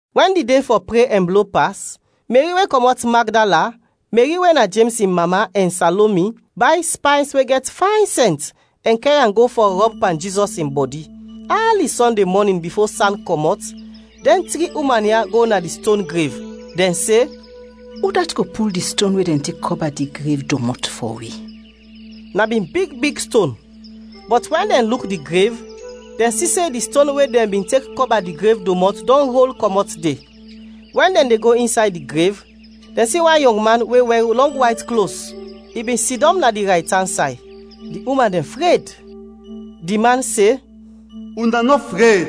Wɛn di de fɔ pre ɛn blo pas, Meri we kɔmɔt Magdala, Meri we na Jems in mama, ɛn Salomi, bay spays we gɛt fayn sɛnt ɛn kɛr am go fɔ rɔb pan Jizɔs in bɔdi. Ali Sɔnde mɔnin bifo san kɔmɔt, dɛn tri uman ya go na di ston grev. Dɛn se, “Udat go pul di ston we dɛn tek kɔba di grev domɔt fɔ wi?” (Na bin big big ston.) Bɔt wɛn dɛn luk di grev, dɛn si se di ston we dɛn bin tek kɔba di grev domɔt dɔn rol kɔmɔt de. Wɛn dɛn de go insay di grev, dɛn si wan yɔng man we wɛr lɔng wayt klos, i bin sidɔm na di raytan say. Di uman dɛn fred! Di man se, “Una nɔ fred!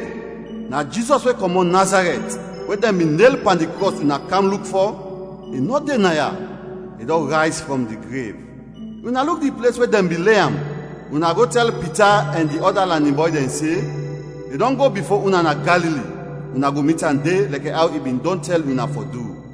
Na Jizɔs we kɔmɔt Nazarɛt, we dɛn bin nel pan di krɔs una kam luk fɔ. I nɔ de ya, i dɔn rayz frɔm di grev. Una luk di ples we dɛn bin le am. Una go tɛl Pita ɛn di ɔda lanin bɔy dɛn se, ‘I dɔn go bifo una na Galili, una go mit am de, lɛkɛ aw i bin dɔn tɛl una fɔ du.’”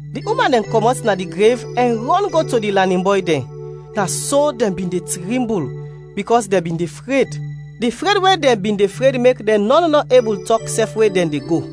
Di uman dɛn kɔmɔt na di grev ɛn rɔn go to di lanin bɔy dɛn; na so dɛn bin de trimbul, bikɔs dɛn bin de fred. Di fred we dɛn bin de fred mek dɛn nɔn nɔ ebul tɔk sɛf we dɛn de go. [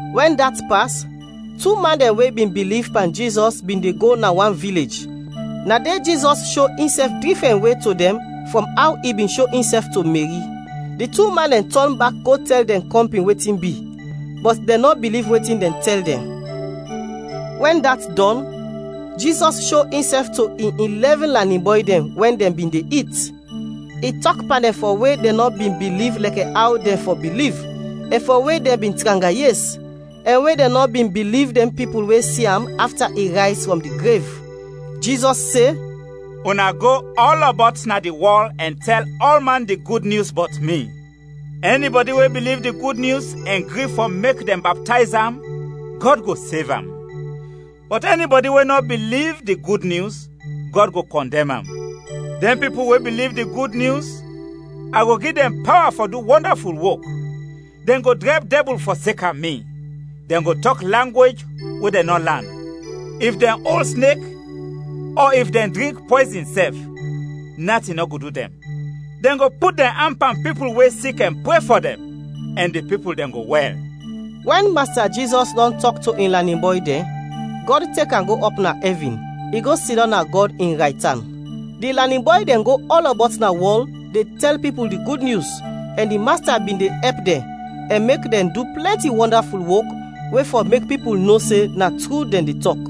Wɛn dat pas, tu man dɛn we bin biliv pan Jizɔs bin de go na wan vilej, na de Jizɔs sho insɛf difrɛn we to dɛn frɔm aw i bin sho insɛf to Meri. Di tu man dɛn tɔn bak go tɛl dɛn kɔmpin wetin bi, bɔt dɛn nɔ biliv wetin dɛn tɛl dɛn. Wɛn dat dɔn, Jizɔs sho insɛf to in ilɛvin lanin bɔy dɛn wɛn dɛn bin de it. I tɔk pan dɛn fɔ we dɛn nɔ bin biliv lɛkɛ aw dɛn fɔ biliv, ɛn fɔ we dɛn bin tranga yes, ɛn we dɛn nɔ bin biliv dɛn pipul we si am afta i rayz frɔm di grev. Jizɔs se, “Una go ɔlɔbɔt na di wɔl ɛn tɛl ɔlman di Gud Nyus bɔt mi. Ɛnibɔdi we biliv di Gud Nyus ɛn gri fɔ mek dɛn baptayz am, Gɔd go sev am. Bɔt ɛnibɔdi we nɔ biliv di Gud Nyus, Gɔd go kɔndɛm am. Dɛn pipul we biliv di Gud Nyus, a go gi dɛn pawa fɔ du wɔndaful wok: dɛn go drɛb dɛbul fɔseka mi; dɛn go tɔk langwej we dɛn nɔ lan; if dɛn ol snek ɔ if dɛn drink pɔyzin sɛf, natin nɔ go du dɛn; dɛn go put dɛn an pan pipul we sik ɛn pre fɔ dɛn, ɛn di pipul dɛn go wɛl.” Wɛn Masta Jizɔs dɔn tɔk to in lanin bɔy dɛn, Gɔd tek am go ɔp na ɛvin, i go sidɔm na Gɔd in raytan. Di lanin bɔy dɛn go ɔlɔbɔt na wɔl de tɛl pipul di Gud Nyus, ɛn di Masta bin de ɛp dɛn, ɛn mek dɛn du plɛnti wɔndaful wok we fɔ mek pipul no se na tru dɛn de tɔk.]